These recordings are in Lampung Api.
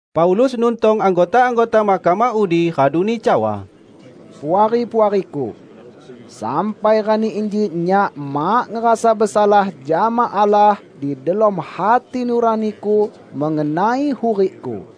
Paulus nuntong anggota-anggota mahkamah udi raduni cawa, "Puari-puariku! Sampai rani inji nyak mak ngerasa besalah jama Allah di delom hati nuraniku mengenai hurikku."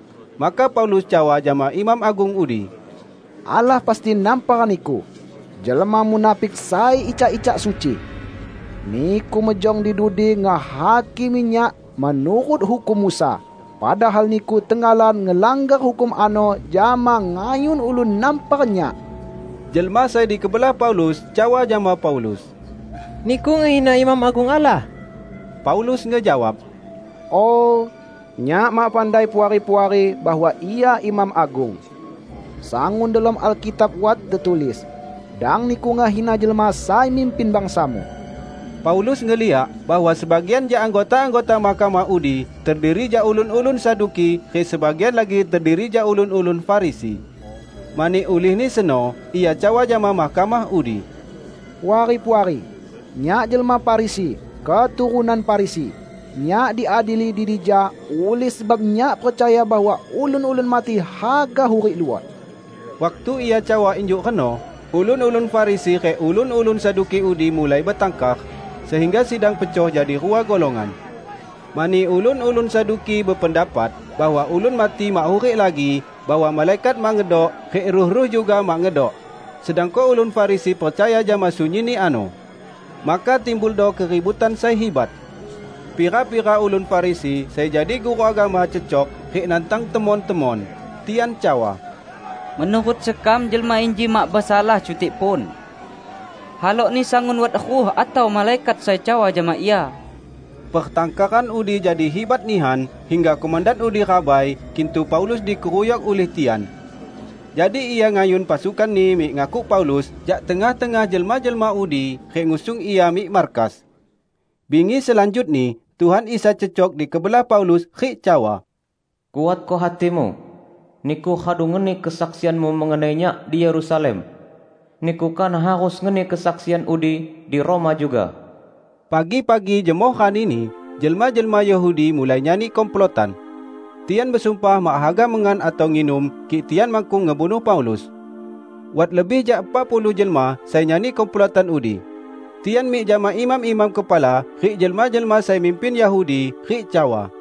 Maka Paulus cawa jama imam agung udi, "Allah pasti nampar niku, jelma munafik sai icak-icak suci! Niku mejong di dudi ngehakimi nyak menurut hukum Musa, padahal niku tenggalan ngelanggar hukum ano jama ngayun ulun nampar nyak!" Jelma sai di kebelah Paulus cawa jama Paulus, "Niku ngehina imam agung Allah!" Paulus ngejawab, "Oh, nyak mak pandai, Puari-puari bahwa ia imam agung. Sangun delom Alkitab wat tetulis, 'Dang niku ngehina jelma sai mimpin bangsamu.' " Paulus ngeliak bahwa sebagian jak anggota-anggota mahkamah udi terdiri jak ulun-ulun Saduki rik sebagian lagi terdiri jak ulun-ulun Farisi. Mani ulihni seno ia cawa jama mahkamah udi, "Puari-puari! Nyak jelma Farisi, keturunan Farisi. Nyak diadili di dija ulih sebab nyak percaya bahwa ulun-ulun mati haga hurik luot." Waktu ia cawa injuk reno, ulun-ulun Farisi rik ulun-ulun Saduki udi mulai betangkar, sehingga sidang pecoh jadi rua golongan. ( Mani ulun-ulun Saduki bependapat bahwa ulun mati mak hurik lagi, bahwa malaikat mak ngedok, rik ruh-ruh juga mak ngedok; sedangko ulun Farisi percaya jama sunyinni ano.) Maka timbuldo keributan sai hibat. Pira-pira ulun Farisi sai jadi guru agama cecok rik nantang temon-temon. Tian cawa, "Menurut sekam jelma inji mak besalah cutik pun! Halokni sangun wat ruh atau malaikat sai cawa jama ia!" Pertangkaran udi jadi hibat nihan hingga komandan udi rabai kintu Paulus dikeruyok ulih tian. Jadi ia ngayun pasukanni mik ngakuk Paulus jak tengah-tengah jelma-jelma udi rik ngusung ia mik markas. Bingi selanjutni Tuhan Isa cecok di kebelah Paulus rik cawa, "Kuatko hatimu! Niku radu ngeni kesaksianmu mengenai Nyak di Yerusalem. Niku kanah harus ngeni kesaksian udi di Roma juga." Pagi-pagi jemoh ranini, jelma-jelma Yahudi mulai nyani komplotan. Tian besumpah mak haga mengan atau nginum kik tian makkung ngebunuh Paulus. Wat lebih jak epak puluh jelma sai nyani komplotan udi. Tian mik jama imam-imam kepala rik jelma-jelma sai mimpin Yahudi rik cawa,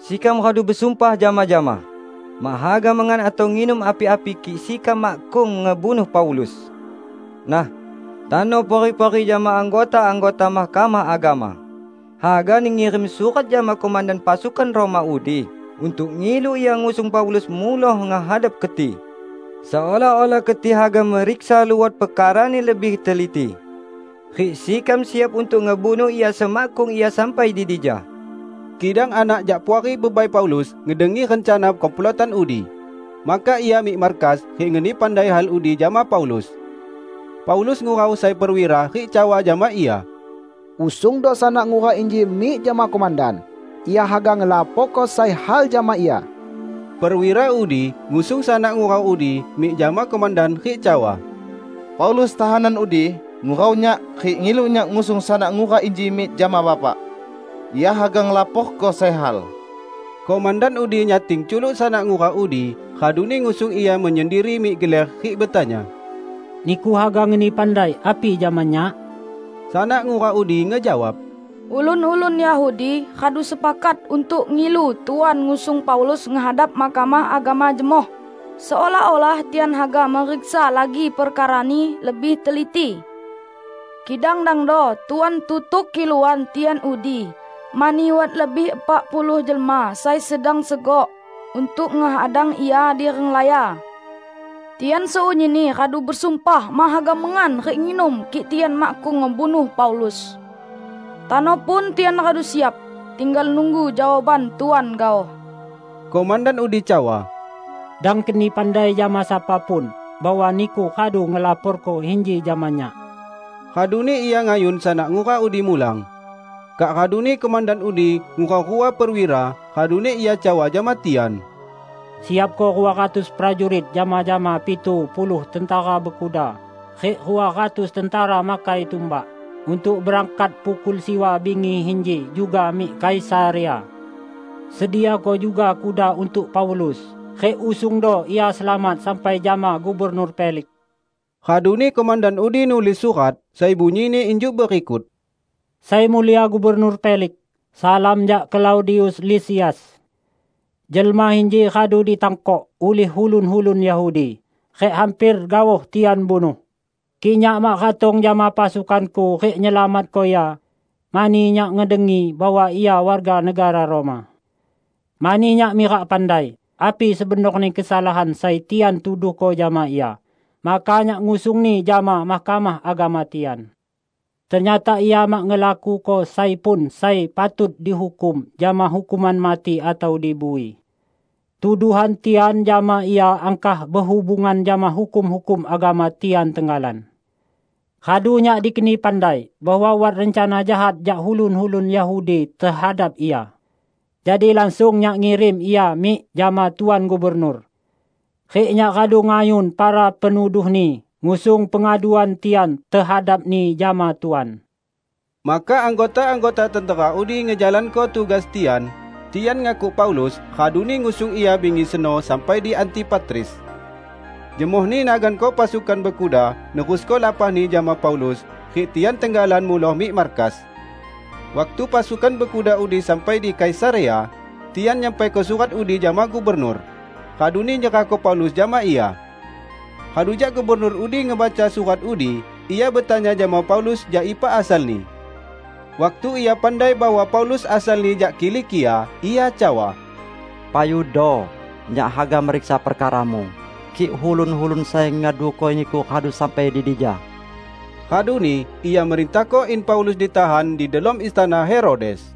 "Sekam radu besumpah jama-jama, mak haga mengan atau nginum api-api kik sekam makkung ngebunuh Paulus. Nah, tano Puari-puari jama anggota-anggota Mahkamah Agama hagani ngirim surat jama komandan pasukan Roma udi untuk ngilu ia ngusung Paulus muloh ngehadap keti, seolah-olah keti haga meriksa luot perkarani lebih teliti. Rik sekam siap untuk ngebunuh ia semakkung ia sampai di dija." Kidang anak jak puari bebai Paulus ngedengi rencana komplotan udi. Maka ia mik markas rik ngeni pandai hal udi jama Paulus. Paulus ngurau sai perwira rik cawa jama ia, "Usungdo sanak ngura inji mik jama komandan; ia haga ngelaporko sai hal jama ia." Perwira udi ngusung sanak ngura udi mik jama komandan rik cawa, "Paulus, tahanan udi, ngurau nyak rik ngilu nyak ngusung sanak ngura inji mik jama Bapak; ia haga ngelaporko sai hal." Komandan udi nyating culuk sanak ngura udi, raduni ngusung ia menyendiri mik geler rik betanya, "Niku haga ngeni pandai api jama nyak?" Sanak ngura udi ngejawab, "Ulun-ulun Yahudi radu sepakat untuk ngilu Tuan ngusung Paulus ngehadap Mahkamah Agama jemoh, seolah-olah tian haga meriksa lagi perkarani lebih teliti. Kidang dangdo Tuan tutuk kiluan tian udi, mani wat lebih epak puluh jelma sai sedang segok untuk ngehadang ia di renglaya. Tian sunyinni radu besumpah mak haga mengan rik nginum kik tian makkung ngebunuh Paulus. Tano pun tian radu siap; tinggal nunggu jawaban Tuan gaoh." Komandan udi cawa, "Dang keni pandai jama sapa pun bahwa niku radu ngelaporko inji jama nyak." Raduni ia ngayun sanak ngura udi mulang. Kak raduni komandan udi ngurau rua perwira, raduni ia cawa jama tian, "Siapko rua ratus prajurit jama-jama pitu puluh tentera bekuda rik rua ratus tentera makai tumbak untuk berangkat pukul siwa bingi inji juga mik Kaisarea. Sediako juga kuda untuk Paulus rik usungdo ia selamat sampai jama Gubernur Feliks." Raduni komandan udi nulis surat sai bunyini injuk berikut, "Sai Mulia Gubernur Feliks. Salam jak Klaudius Lisias! Jelma inji radu ditangkok ulih ulun-ulun Yahudi rik hamper gaoh tian bunuh, kik nyak mak ratong jama pasukanku rik nyelamatko ia; mani nyak ngedengi bahwa ia warga negara Roma. Mani nyak mirak pandai api sebenorni kesalahan sai tian tuduhko jama ia, maka nyak ngusungni jama Mahkamah Agama tian. Ternyata ia mak ngelakuko sai pun sai patut dihukum jama hukuman mati atau di bui. Tuduhan tian jama ia angkah behubungan jama hukum-hukum agama tian tenggalan. Radu nyak dikeni pandai bahwa wat rencana jahat jak ulun-ulun Yahudi tehadap ia. Jadi langsung nyak ngirim ia mik jama Tuan Gubernur. Rik nyak radu ngayun para penuduhni ngusung pengaduan tian tehadapni jama Tuan." Maka anggota-anggota tentera udi ngejalanko tugas tian. Tian ngakuk Paulus raduni ngusung ia bingi seno sampai di Antipatris. Jemohni naganko pasukan bekuda nerusko lapahni jama Paulus, rik tian tenggalan muloh mik markas. Waktu pasukan bekuda udi sampai di Kaisarea, tian nyampaiko surat udi jama gubernur, raduni nyerahko Paulus jama ia. Radu jak gubernur udi ngebaca surat udi, ia betanya jama Paulus jak ipa asalni. Waktu ia pandai bahwa Paulus asalni jak Kilikia, ia cawa, "Payudo! Nyak haga meriksa perkaramu, kik ulun-ulun sai ngaduko niku radu sampai di dija." Raduni ia merintahko in Paulus ditahan di delom istana Herodes.